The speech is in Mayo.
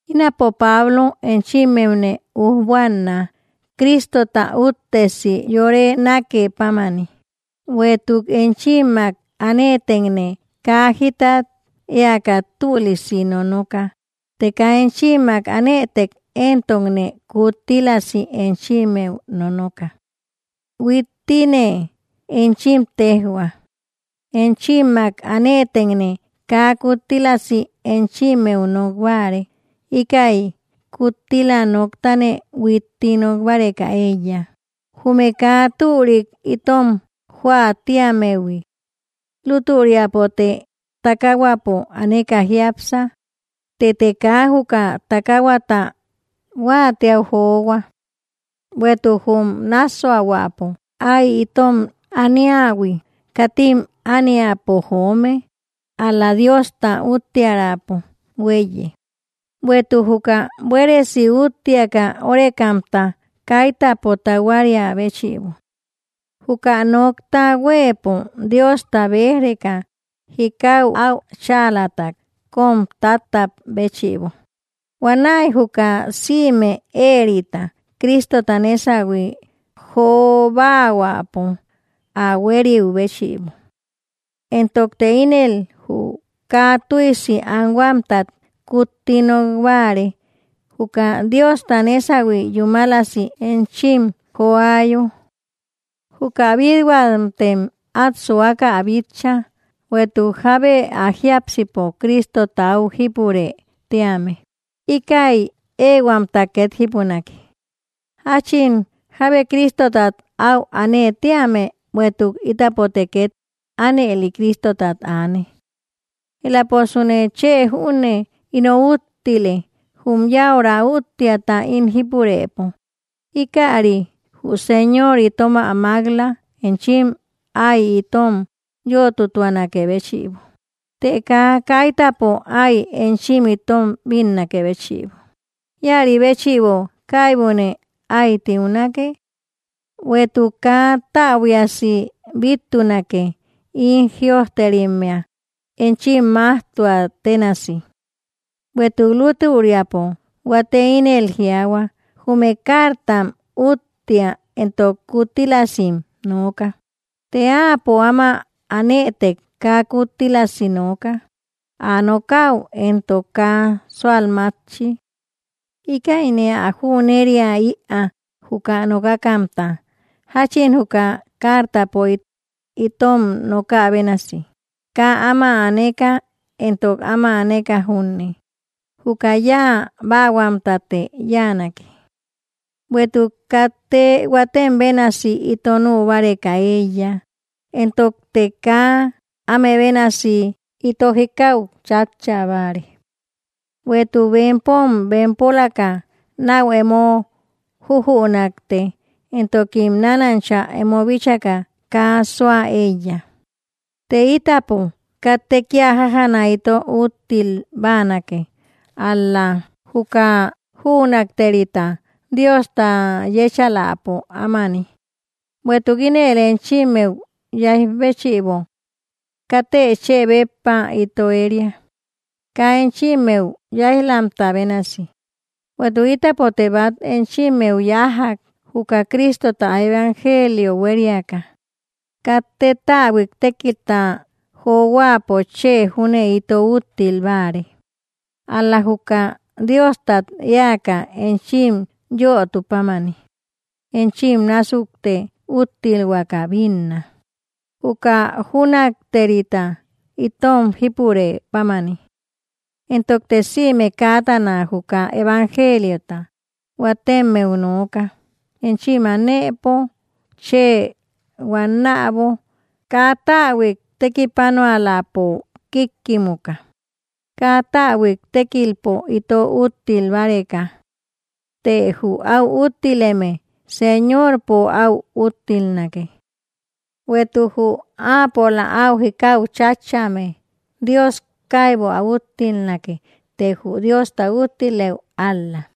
Ínapo Pablo enchimmeune ujbuanna Cristota úttesi yore nake pámani, bueïtuk enchimmak anëtekne kaa jikat eäka tülisi nonoka, të kaa enchimmak anëtek entokne kuttílasi enchimmeu nonoka. Huittine enchim tejhua, enchimmak anëtekne kaa kuttílasi enchimmeu nok báare, íkäi kuttila noktane huitti nok báreka eíya, jume kaa türik itom joä tiammehui. Lútüriapote takahuäpo aneka jiápsa, tëte kaa juka takahuata huaatiaü johua. Bueïtuk jum nassuahuäpo ái itom ito aniähui katim imï ániapo joome, ál‑la Diosta uttiärapo hueiye, bueïtuk juka buéresi úttiaka órekamta kaitäpo tahuaria béchïbo. Juka nokta huëpo Diosta bej‑reka jikau au cháalata kom tatap béchïbo, huanäi juka sïme éerita Cristota nesahui jobahuäpo ä hueriu béchïbo. Éntokte ínël jü kaa tüisi anhuamtat kutti nokbare, juka Diosta nesahui yúmalsi enchim joayo. Juka bithuamtem at suaka ä bitcha. Bueïtuk jábe ä jiasipo Cristota au jípurë tíame, íkäi ehuamta ket jípunake, jachin jábe Cristotat áu anë tíame, bueïtuk ítapote ket anëli Cristotat aane. Elaposune chë júne ino úttile, jum yäura úttiata ín jípurëpo, ikäri jü Señor itom ä mak‑la enchim ái itom yötutuanakë béchïbo, të kaa kaitäpo ái enchim itom bínnakë béchïbo, ïari béchïbo kaibune ái tiunake. Bueïtuk kaa täbuiasi bittunake, ín jïojterimmea enchim majtuam tenasi. Bueïtuk lútüriapo huate ínel jiaahua, jume cartam úttia entok kuttílasim nooka, të áapo áma anëtek kaa kuttílasi nooka, ä nokaü entok kaa sualmatchi. Íkäine ä jüneria‑ïa juka nokakamta, jachin juka cartapo itom nokä bénasi, kaa áma aneka entok áma aneka junne, juka yáa baahuamtate yáanake. Bueïtuk katte huatem bénasi ito nübareka eíya, entokte kaa áme bénasi ito jikau chatcha báare; bueïtuk bempom bempolaka nau emo jujünakte, entokim nanancha emo bíchaka kaa sua eíya. Të itapo katte kia jájana ito úttil báanake, ál‑la juka jünakterita Diosta yechaläpo ámani, bueïtuk ínël enchimmeu yaij béchïbo. Katte chë béppa ito eria, kaa enchimmeu yaijlamta bénasi, bueïtuk ítapote bat echimmeu yájjak juka Cristota evangelio hueriaka. Katte täbuik tékilta johuäpo chë júne ito úttil báare, ál‑la juka Diostat eäka enchim yöotu pámani, enchim násukte úttilhuaka binná, juka jünakterita itom jípurë pámani. Éntokte sïme kätana juka evangeliota huatemmeu nooka, enchim anëpo chë huannabo, kaa täbuik tekipanuälapo kikkimuka, kaa täbuik tekilpo ito úttil báreka. Të jü au úttileme, Señorpo au úttilnake. Bueïtuk jü apola au jikau chatchame Dios kaybu ä úttilnake, të jü Diosta úttileü ál‑la.